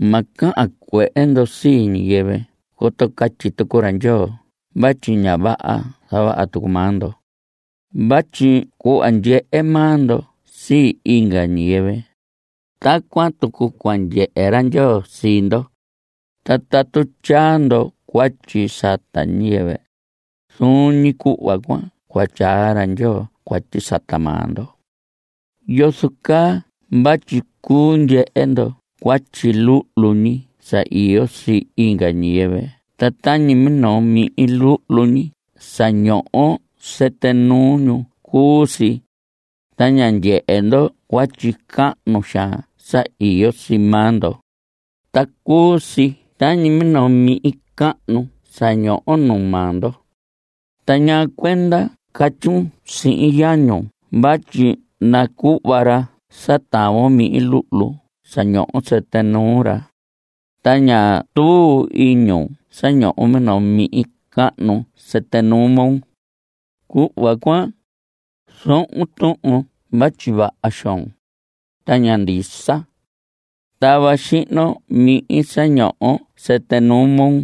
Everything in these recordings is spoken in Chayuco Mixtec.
Ma cahan cuehe ndo sii ñiyɨvɨ coto catyi tucu ra Ndyoo vatyi ña vaha zavaha tucu maa ndo. Vatyi cuhva ndyehe maa ndo sii inga ñiyɨvɨ, tacuan tucu cua ndyehe ra Ndyoo sii ndo. Ta tatu tyaa ndo cuatyi sata ñiyɨvɨ, zuun ñi cuhva cuan cua tyaa ra Ndyoo cuatyi sata maa ndo. ¿Yozo caa vatyi cuu ndyehe ndo cuatyi luhlu ñi sa iyo sii inga ñiyɨvɨ ta tañi minoo mihin luhlu ñi sa ñoho sɨtɨ nuu ñu cuu si? Ta ña ndyehe ndo cuatyi cahnu xaan sa iyo sii maa ndo, ta cuu si tañi minoo mihin cahnu sa ñoho nuu maa ndo. Ta ñaa cuenda catyun sihin yañun vatyi nacuhva ra sa tavon mihin luhlu sa ñoho sɨtɨ nuu ra, ta ña tuu iñun sa ñoho minoo mihin cahnu sɨtɨ nuu moo. Cuhva cuan, zohon tuhun vatyi vaha xoon, ta ña ndisa. Tava xihnon mihin sa ñoho sɨtɨ nuu moo,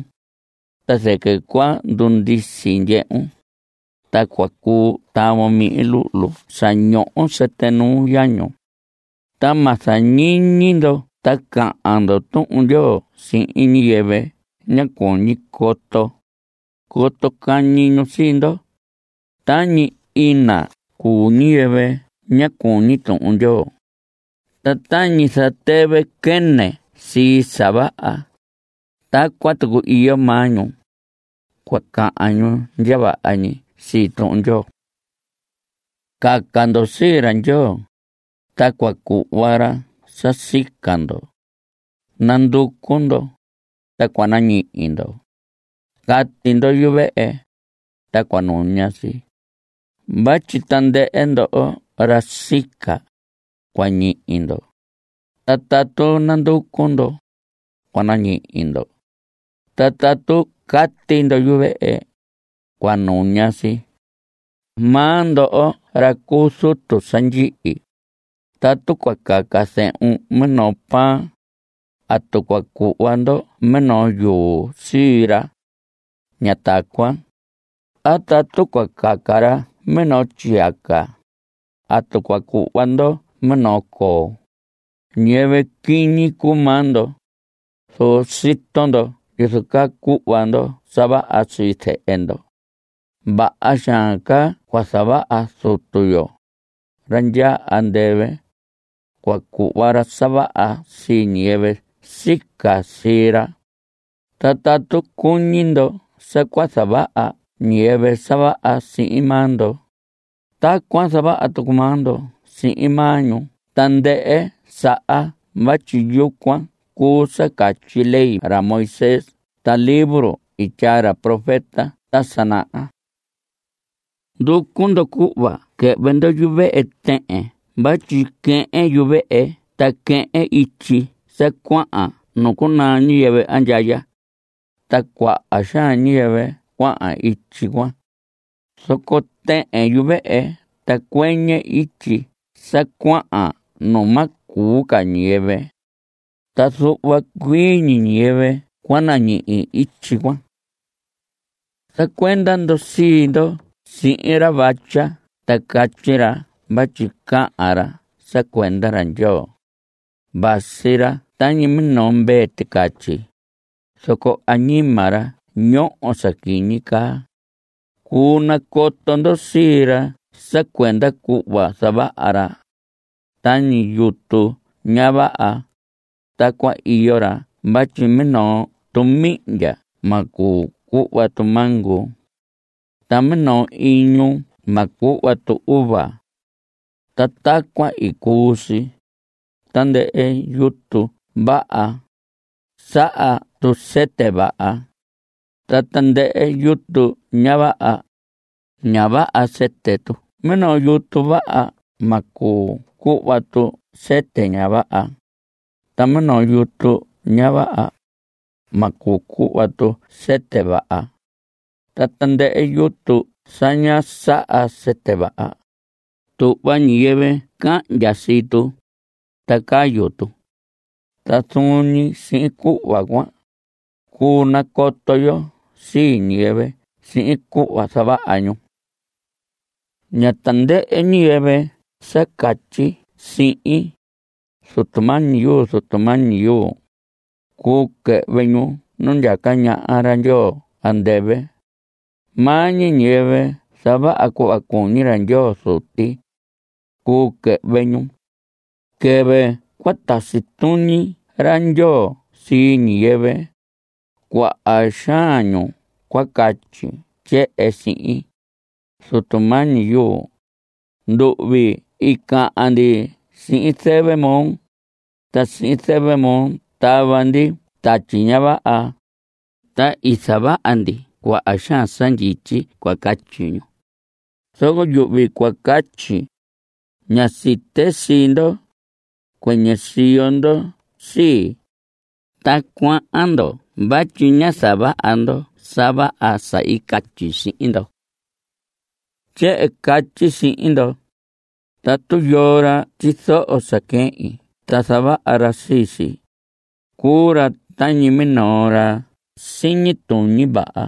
ta zɨquɨ cua ndundisi ndyehun, ta cua cuu tavon mihin luhlu sa ñoho sɨtɨ nuu yañun. Ta ma zañiñi ndo ta cahan ndo Tuhun Ndyoo sihin ñiyɨvɨ ña cuñi coto, coto cañi ñu sii ndo. Tañi ina cuu ñiyɨvɨ ña cuñi Tuhun Ndyoo. Ta tañi zatɨvɨ quɨnɨ sii sa vaha, tacuan tucu iyo maa ñu. Cua cahan ñu ndya vaha ñi sii Tuhun Ndyoo. Caca ndo sii ra Ndyoo, ta cua cuhva ra sa sica ndo. Nanducu ndo, ta cua nañihi ndo. Cati ndo yuvehe, ta cua nuña si. Vatyi tandɨhɨ ndoho ra sica, cua ñihi ndo. Ta tatu nanducu ndo, cua nañihi ndo. Ta tatu cati ndo yuvehe, cua nuña si. Maa ndo ra cu zutu sa ndyihi, tatu cua caca zehun minoo pan, ¿atu cua cuhva ndo minoo yuu sii ra? Ña tacuan. A tatu cua caca ra minoo tyiyaca, ¿atu cua cuhva ndo minoo coo? Ñiyɨvɨ quiñi cuu maa ndo, zoco sito ndo yozo caa cuhva ndo sa vaha sii zehe ndo, vaha xaan ca cua zavaha Zutu yo, ra ndyaa andɨvɨ. Cua cuhva ra sa vaha sii ñiyɨvɨ sica sii ra. Ta tatu cuñi ndo sa cua zavaha ñiyɨvɨ sa vaha sihin maa ndo, tacuan zavaha tucu maa ndo sihin maa ñu tandɨhɨ saha vatyi yucuan cuu sa catyi ley ra Moisés ta libro i tyaa ra profeta ta sa naha. Nducu ndo cuhva quɨhvɨ ndo yuvehe tɨhɨn vatyi quɨhɨn yuvehe ta quɨhɨn ityi sa cuahan nu cunaa ñiyɨvɨ andyaya. Ta cuaha xaan ñiyɨvɨ cuahan ityi cuan. Zoco tɨhɨn yuvehe ta cuɨñɨ ityi sa cuahan nu ma cuu ca ñiyɨvɨ, ta zuhva cuii ñi ñiyɨvɨ cua nañihi ityi cuan. Zacuenda ndo sii ndo sihin ra vatya ta catyi ra vatyi cahan ra sa cuenda ra Ndyoo. Vasi ra tañi minoo mvee ticatyi, zoco añima ra ñoho sa quiñi caa. Cuu nacoto ndo sii ra sa cuenda cuhva zavaha ra. Tañi yutu ña vaha, tacuan iyo ra vatyi minoo tu mihndya ma cuu cuhva tu mango. Ta minoo iñu ma cuhva tu uva. Ta tacuan cuu si. Tandɨhɨ yutu vaha, saha tu sɨtɨ vaha. Ta tandɨhɨ yutu ña vaha, ña vaha sɨtɨ tu. Minoo yutu vaha, ma cuu cuhva tu sɨtɨ ña vaha. Ta minoo yutu ña vaha, ma cuu cuhva tu sɨtɨ vaha. Ta tandɨhɨ yutu sa ña saha sɨtɨ vaha, tuhva ñiyɨvɨ cahndya sii tu, ta cayu tu. Ta zuun ñi sihin cuhva cuan, cuu nacoto yo sii ñiyɨvɨ sihin cuhva zavaha ñu. Ña tandɨhɨ ñiyɨvɨ sa catyi sihin: “Zutu mañi yuu, Zutu mañi yuu”, cuu quɨhvɨ ñu nu ndyaca ñaha ra Ndyoo andɨvɨ. Maa ñi ñiyɨvɨ zavaha cuhva cuñi ra Ndyoo Zuti, cuu quɨhvɨ ñu. Quɨvɨ cua tasi tuñi ra Ndyoo sii ñiyɨvɨ, cuaha xaan ñu cua catyi tyehen sihin: “Zutu mañi yuu, nduhvi i cahan ndi sihin zɨvɨ moo, ta sihin zɨvɨ moo tava ndi tatyi ña vaha, ta i zavaha ndi cuaha xaan sa ndyityi.” Cua catyi ñu. Zoco yuhvi cua catyi: “Ña site sii ndo. Cuɨnɨ siyo ndo sii, ta cuahan ndo vatyi ñá zavaha ndo sa vaha sa i catyi sihin ndo.” Tyehen catyi sihin ndo, tatu yoo ra tyizoho sa quehin ta zavaha ra sii si, cuu ra tañi minoo ra siñi tuñi vaha.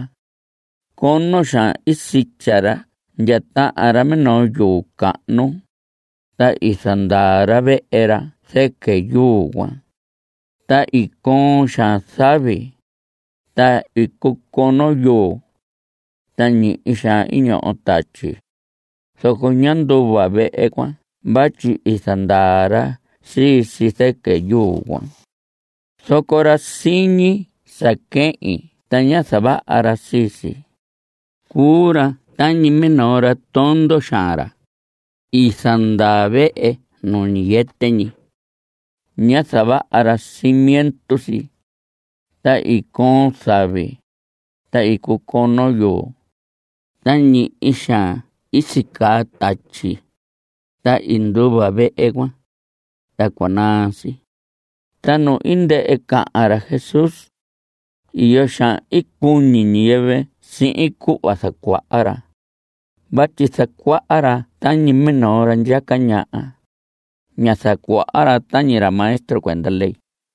Cono xaan i sitya ra ndya tahan ra minoo yuu cahnu, ta i zandaa ra vehe ra zɨquɨ yuu cuan. Ta i coon xaan zavi, ta i cucono yuu. Ta ñihi xaan i ñoho tatyi, zoco ñá nduva vehe cuan vatyi i zandaa ra sii si zɨquɨ yuu cuan. Zoco ra siñi sa quehin ta ña zavaha ra sii si, cuu ra tañi minoo ra tondo xaan, ra i zandaa vehe nu ñiyɨtɨ ñi. Ñá zavaha ra cimiento si. Ta i coon zavi. Ta i cucono yuu, ta ñihi xaan i sicaa tatyi, ta i nduva vehe cuan, ta cua naa si. Ta nu i ndɨhɨ cahan ra Jesús, iyo xaan i cuñi ñiyɨvɨ sihin cuhva zacuaha ra vatyi zacuaha ra tañi minoo ra ndyaca ñaha. Ñá zacuaha ra tañi ra maestro cuenda ley.